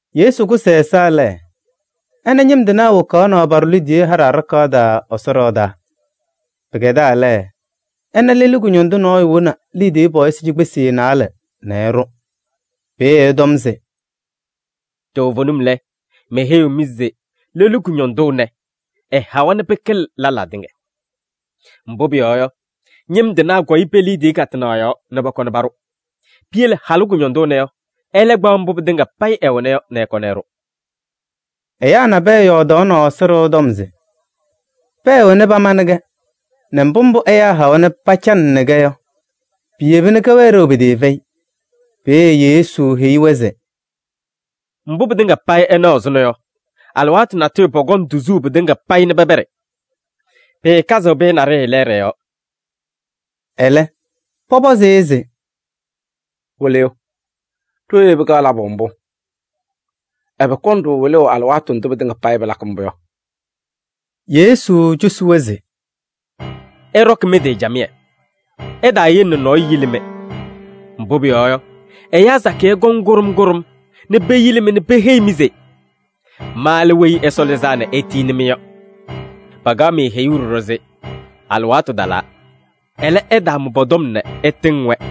Yesu kʋsɩ ɛ-ɛza lɛ, ɛna ñɩm tɩnaa wokaɣ paɖʋʋ liidiye haɖɛ aɖakaɣ taa Ɛsɔ ɖɩɣa taa. Pɩkɛdaa lɛ, ɛna lelu kʋñɔndʋ nɔɔyʋ woni liidiye pɔɔyɩsɩ cikpesi naalɛ nɛ ɛɖʋ. Peeye ɛtɔm se: “Toovenim lɛ, meheyiɣ-mɩ se lelu kʋñɔndʋ ɛnɛ, ɛhawa nɛ pɩkɩlɩ lɛlaa tɩŋa. Mbʋ pʋyɔɔ yɔ, ñɩm tɩnaa kɔyɩ pe-liidiye katɩnaɣ yɔɔ nɛ pɔkɔnɩ paɖʋ. Piyele halʋ kʋñɔndʋ ɛnɛ yɔ, ɛlɛ kpaɣ mbʋ pɩtɩŋa payɩ ɛwɛna yɔ nɛ ɛkɔnɩ ɛɖʋ.” Ɛyaa nabɛyɛ yɔɔdaɣnɩ Ɛsɔ ɖɩɣa tɔm se pɛɛ wena pamanɩ-kɛ nɛ mbʋ mbʋ ɛyaa hawa nɛ pacanɩnɩ-kɛ yɔ, piyeba nɛ kɛwɛɛ ɖeu pɩtɩɩfɛyɩ. Peeye Yesu heyi-wɛ se: “Mbʋ pɩtɩŋa payɩ ɩnaɣ ɛzʋnɔ yɔ, alɩwaatʋ natʋyʋ pɔkɔŋ tuzuu pɩtɩŋa payɩ nɛ pɛpɛɖɩ. Pɩɩkazɩɣ pɩyɛ naɖɩyɛ lɛɛɖɛ yɔɔ.” Ɛlɛ, pɔpɔzɩ-ɩ se: “Wɩlɩyʋ! Ɖooye pɩkaɣ labʋ mbʋ? Ɛbɛ kɔŋ-ɖʋ wɩlʋʋ alɩwaatʋ ndʋ pɩtɩŋa payɩ pɩlakɩ mbʋ yɔ?” Yesu cosi-wɛ se: “Ɩɖɔkɩ mɩ-tɩ camɩyɛ, ɩtaayele nɛ nɔɔyʋ yili-mɩ. Mbʋ pʋyɔɔ yɔ, ɛyaa sakɩyɛ kɔŋ Kʋɖʋm kʋɖʋm nɛ peyili-mɩ nɛ peheyi-mɩ se: ‘Ma lɛ Weyi Ɛsɔ Lɩzaa nɛ etiyini-mɩ’ yɔ. Pakaɣ-mɩ heyuu ɖɔɖɔ se: ‘Alɩwaatʋ talaa.’ Ɛlɛ, ɩtaamʋ pɔ-tɔm nɛ ɩtɩŋ-wɛ.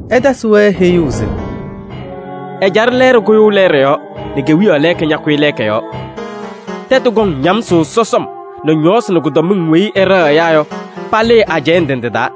Ɛtasɩ-wɛ heyuu se: “Ɛjaɖɛ lɛɛɖɛ kʋyʋʋ lɛɛɖɛ yɔɔ nɛ kewiyaɣ lɛɛka ñakʋyɩ lɛɛka yɔɔ. Tɛtʋ kɔŋ ñamsʋʋ sɔsɔm nɛ ñɔɔsɩ nɛ kʋdɔmɩŋ weyi ɩɖɛɣ ɛyaa yɔ, palɩɩ ajɛɛ ndɩ ndɩ taa.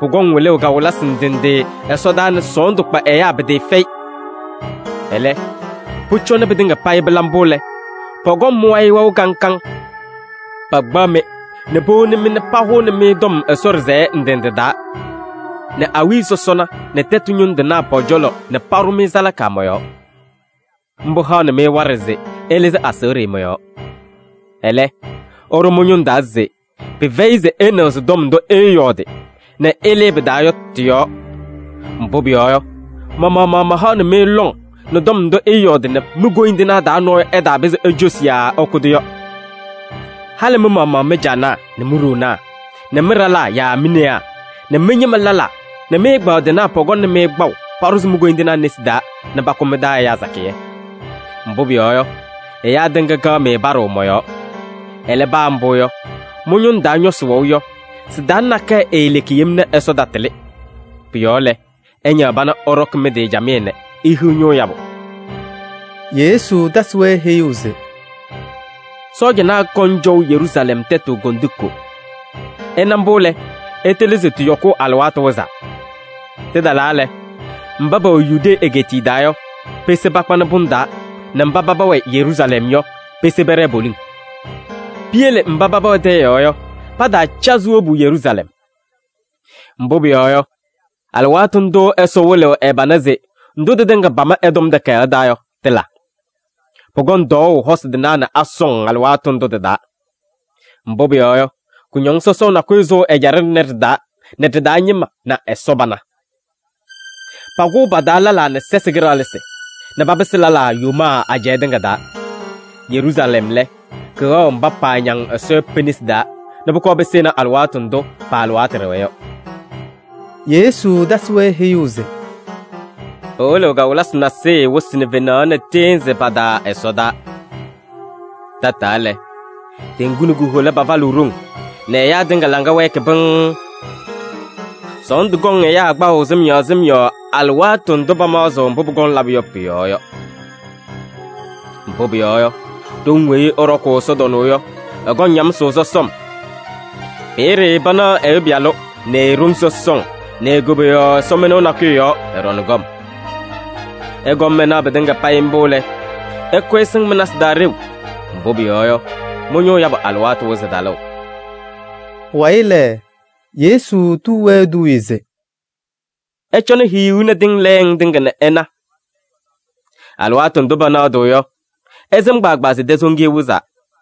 Pʋkɔŋ wɩlʋʋ kawɩlɩsɩ ndɩ ndɩ ɛsɔdaa nɛ sɔɔndʋ kpa ɛyaa pɩtɩɩfɛyɩ. Ɛlɛ, pʋcɔ nɛ pɩtɩŋa payɩ pɩla mbʋ lɛ, pɔkɔŋ mɩ-wayɩ wɛʋ kaŋ kaŋ. Pakpaɣ-mɩ nɛ powoni-mɩ nɛ pahʋnɩ-mɩ tɔm Ɛsɔ ɖɩsɛyɛ ndɩ ndɩ taa nɛ awiya sɔsɔna nɛ tɛtʋ ñʋŋ tɩnaa pɔ-cɔlɔ nɛ paɖʋ-mɩ salaka mɔ-yɔɔ. Mbʋ haɣnɩ-mɩ waɖɛ se ɩlɩzɩ aseɣɖe mɔ-yɔɔ. Ɛlɛ, ɩɖʋ mɩ-ñʋŋ taa se pɩfɛyɩ se ɩnɩɣzɩ tɔm ndʋ ɩɩyɔɔdɩ nɛ ɩlɩɩ pɩ-taa yɔ tɩ-yɔɔ. Mbʋ pʋyɔɔ yɔ, ma-maɣmaɣ mahaɣnɩ-mɩ lɔŋ nɛ tɔm ndʋ ɩɩyɔɔdɩ nɛ mi-koyindinaa taa nɔɔyʋ ɛtaapɩzɩ ecosi yaa ɛkʋ-tʋ yɔ. Halɩ mɩ-maɣmaɣ mɩ-caanaa nɛ mi-ɖoonaa nɛ mɩ-ɖalaa yaa mi-newaa nɛ mɩ-ñɩma lɛlaa nɛ mɩ-ɛgbaadɩnaa pɔkɔŋnɩ-mɩ kpaʋ paɖʋzɩ mi-koyindinaa nesi taa nɛ pakʋ mɩ-taa ɛyaa sakɩyɛ. Mbʋ pʋyɔɔ yɔ, ɛyaa tɩŋa kaɣ-mɩ paɖʋʋ mɔ-yɔɔ. Ɛlɛ paa mbʋ yɔ, mɩ-ñʋŋ taa nɔsɩ wɛʋ yɔ, sɩ-taa nakɛyɛ eeleki yem nɛ Ɛsɔ tatɩlɩ. Pʋ-yɔɔ lɛ, ɩñaɣ pana ɩɖɔkɩ mɩ-tɩ camɩyɛ nɛ ihiɣ ñʋʋ yabʋ.” Yesu tasɩ-wɛ heyuu se: “Sɔɔjanaa kɔŋ cɔʋ Yeruusalɛm tɛtʋ kondiko. Ɩna mbʋ lɛ, ɩtɩlɩ se tɩ-yɔkʋʋ alɩwaatʋ wɩzaa. Tɩtalaa lɛ, mba pɛwɛ Yudee egeetiye taa yɔ, pese pakpanɩ pʋŋ taa nɛ mba paba wɛ Yeruusalɛm yɔ, pese pɛɖɛɛ poliŋ. Piyele mba paba wɛ tɛyɛ yɔɔ yɔ, pataacazɩ wobu Yeruusalɛm. Mbʋ pʋyɔɔ yɔ, alɩwaatʋ ndʋʋ Ɛsɔ wɩlɩɣ ɛ-pana se ndʋ tɩtɩŋa pama ɛ-Tɔm Takayaɣ taa yɔ tɩla. Pʋkɔŋ tɔɔʋ hosi tɩnaa nɛ asɔŋ alɩwaatʋ ndʋ tɩ-taa. Mbʋ pʋyɔɔ yɔ, kʋñɔŋ sɔsɔʋ nakʋyʋ sʋʋ ɛjaɖɛ ɖɩnɛ ɖɩ-taa nɛ ɖɩ-taa ñɩma na Ɛsɔ pana. Pakʋʋ pa-taa lɛlaa nɛ sɛsɩ kɩɖaɣlɩsɩ nɛ papɩsɩ lɛlaa yomaa ajɛɛ tɩŋa taa. Yeruusalɛm lɛ, kɩwɛɣ mba paañaŋ Ɛsɔ yɔ pe-nesi taa nɛ pʋkɔɔ pɩsɩnɩ alɩwaatʋ ndʋ pa-alɩwaatʋ ɖɛwa yɔ.” Yesu tasɩ-wɛ heyuu se: “Pɩwɩlɩɣ kawɩlɩsɩ nasɩyɩ wɩsɩ nɛ fenaɣ nɛ tɩɩnzɩ pa-taa ɛsɔdaa. Tataa lɛ, teŋgu nɛ ku-hola pafalɩɣ ɖoŋ nɛ ɛyaa tɩŋa laŋa wɛɛkɩ pɩŋŋ. Sɔɔndʋ kɔŋ ɛyaa kpaʋ sɩm yɔɔ sɩm yɔɔ alɩwaatʋ ndʋ pamaɣzɩɣ mbʋ pʋkɔŋ labʋ yɔ pʋ-yɔɔ yɔ. Mbʋ pʋyɔɔ yɔ, ɖoŋ weyi ɩɖɔkʋʋ ɛsɔtɔnʋʋ yɔ, ɩkɔŋ ñamsʋʋ sɔsɔm. Peeye panaɣ Ɛyʋ Pɩyalʋ nɛ e-ɖoŋ sɔsɔŋ nɛ e-koboyaɣ ɛsɔmɩnʋʋ nakʋyʋ yɔɔ, ɛɖɔŋ kɔm. Ɩkɔm ɩnaɣ pɩtɩŋa payɩ mbʋ lɛ, ɩkʋyɩ ɩsɩŋ mɩ-nasɩ taa ɖeu, mbʋ pʋyɔɔ yɔ, mɩ-ñʋʋ yabʋ alɩwaatʋ wɩzɩ talʋʋ.” Pʋwayɩ lɛ, Yesu tuu-wɛ eduuye se: “Ɩcɔnɩ hiyuu nɛ tɩŋ lɛɛŋ tɩŋa nɛ ɩna. Alɩwaatʋ ndʋ pɛnɛɣdɩɣ yɔ, ɩsɩm kpaagbaa se tɛsoŋiye wɩzaa.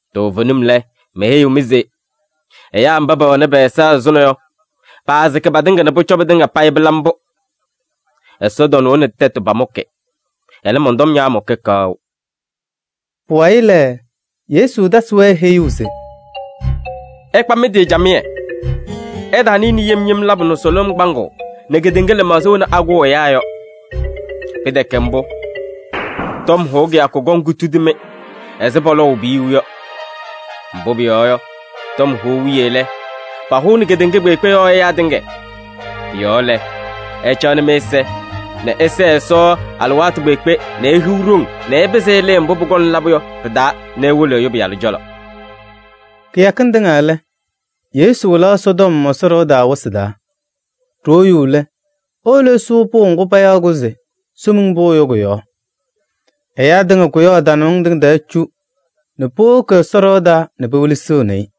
Toovenim lɛ, meheyiɣ-mɩ se: ɛyaa mba pɛwɛnɩ pɛ-ɛza ɛzʋnɔ yɔ, paasɩkɩ patɩŋa nɛ pʋcɔ pɩtɩŋa payɩ pɩla mbʋ. Ɛsɔtɔnʋʋ nɛ tɛtʋ pamʋkɩ. Ɛlɛ, mɔn-tɔm ñaamʋkɩ kaʋ.” Pʋwayɩ lɛ, Yesu tasɩ-wɛ heyuu se: “Ɩkpa mɩ-tɩ camɩyɛ, ɩɩtaanɩnɩ yem yem labʋ nɛ sʋlʋm kpaŋʋʋ nɛ kedeŋa lɩmaɣza wena akʋʋ ɛyaa yɔ. Pɩtɛkɛ mbʋ, tɔm hʋʋ kɩyakʋ kɔŋ kutudi-mɩ ɛzɩ pɔlɔɔʋ piyuu yɔ. Mbʋ pʋyɔɔ yɔ, tɔm hʋʋ wiye lɛ, pahʋʋnɩ kedeŋa kpeekpe yɔɔ ɛyaa tɩŋa. Pʋ-yɔɔ lɛ, ɩcaɣnɩ mɩ-ɛza nɛ ɩsɛɛ Ɛsɔ alɩwaatʋ kpeekpe nɛ ihiɣ ɖoŋ nɛ ɩpɩzɩ ɩlɩɩ mbʋ pʋkɔŋ labʋ yɔ pɩ-taa nɛ iwolo Ɛyʋ Pɩyalʋ cɔlɔ.” Kɩyakɩŋ tɩŋa lɛ, Yesu wɩlaɣ Ɛsɔtɔm Ɛsɔ ɖɩɣa taa wɩsɩ taa. Ɖoo yuu lɛ, ewolo ɛsʋʋ pʋʋ ŋgʋ payaɣ se Somiŋ Pʋʋ yɔ, kʋ-yɔɔ. Ɛyaa tɩŋa kʋyaɣ tanamɩŋ tɩŋa tɛɛ cu nɛ powoki Ɛsɔ ɖɩɣa taa nɛ pewelesiɣni-i.